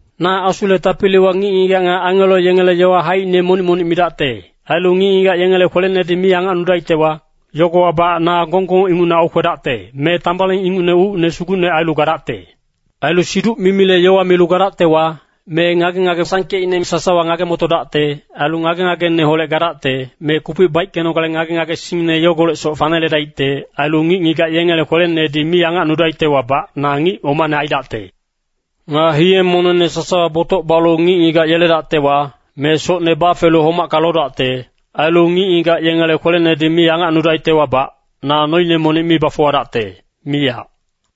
Na Asule tapiliwa ngic-ngigac nga angelo yengele yowa haicine monic-monic midacte, ailu ngic-ngigac yengele kwelenedi mi angacnudaictewa, yogowabac na gonggong ingucne aukwedacte, me tambaling ingucne ucine sugu ailu gadacte. Ailu siduc-mimile yowa milu gadactewa, me ngage-ngage sangkeicne sasawa ngage-motodacte. Ailu ngage-ngageneholec gadacte, me kupic baickenogale ngage-ngagesingne yogolecsoc faneledaicte. Ailu ngic-ngigac yengele kwelenedi mi angacnudaictewabac, na ngic omane aidacte. Nga hiye-monengne sasawa botoc balu ngic-ngigac yeledactewa, me socne bafelu homacka lodacte, ailu ngic-ngigac yengele kwelenedi mi angacnudaictewabac, na noine monic mi bafuwadacte, miyac.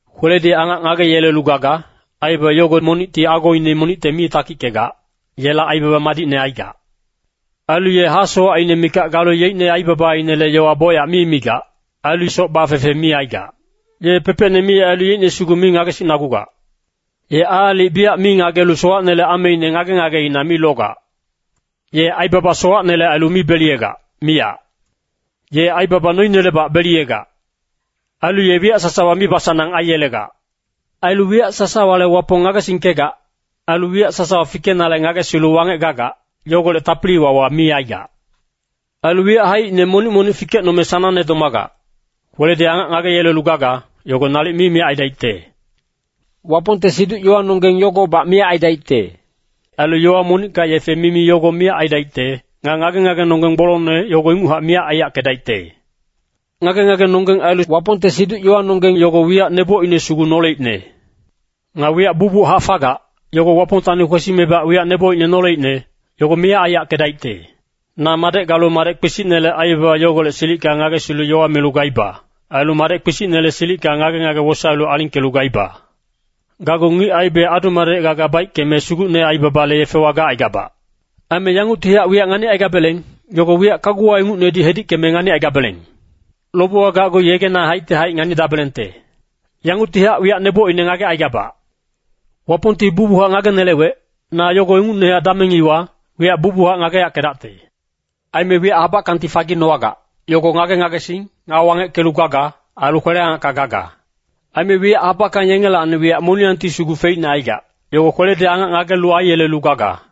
Kweledi angac ngageyelelu gaga, aibaba yogo monicti agoine monicte mi takickegac, yela aibaba madicne aigac. Ailu ye hasowacine mikac galu yeicne aibabainele yowa bocyac mi migac. Ailu soc bafefe mi aigac. Ye pepecne mi ailu yeicne sugu mi ngagesicnagugac. Ye aalic biyac mi ngagelu sowacnele ameine ngage-ngageina mi logac. Ye aibaba sowacnele ailu mi beliyegac, miyac. Ye aibaba noinelebac beliyegac. Ailu ye wiyac sasawa mibasanang aiyelegac. Ailu wiyac sasawale Wapong ngagesingkegac. Ailu wiyac sasawa fikenale ngagesilu wangec gagac, yogolec tapili-wawa mi aigac. Ailu wiyac haicine monic-monic fikecnome sanangne domagac. Kweledi angac ngageyelelu gaga, yogo nalic mi miyac aidaicte. Wapongte siduc-yowanonggeng yogobac miyac aidaicte. Ailu yowa monicka yefe mimi yogo miyac aidaicte. Nga ngage-ngagenonggeng gbolongne, yogo inguchac miyac aiyackedaicte. Ngage-ngagenonggeng ailu Wapongte siduc-yowanonggeng yogo wiyac nebocine sugu noleicne. Nga wiyac bucbuchac fagac, yogo Wapongtacni kwesimebac wiyac nebocine noleicne, yogo miyac aiyackedaicte. Na madec galu madec kpisicnele aibaba yogolec silicka ngagesilu yowa milu gaiba. Ailu madec kpisicnele silicka ngage-ngagene wosaelu alingkelu gaiba. Gacgu ngic aibe adu-madec gaga baickeme, sugucne aibabale yefewa gacaigabac. Aime yanguctihac wiyac nganicaigabeleng, yogo wiyac kaguwa ingucnedi hedickeme nganicaigabeleng. Lobewa gacgu yegena haicti haic nganidabelengte. Yanguctihac wiyac nebocine ngagecaigabac. Wapongti bucbuchac ngagenelewec, na yogo ingucnehac dameng iwa, wiyac bucbuchac ngageyackedacte. Aime wiyac habackangti faginowagac, yogo ngage-ngagesing, nga wangeckelu gaga, ailu kwele-angacka gaga. Aime wiyac habackang yengelacni wiyac moniyangti sugu feicne aigac, yogo kweledi angac ngagelu aiyelelu gaga.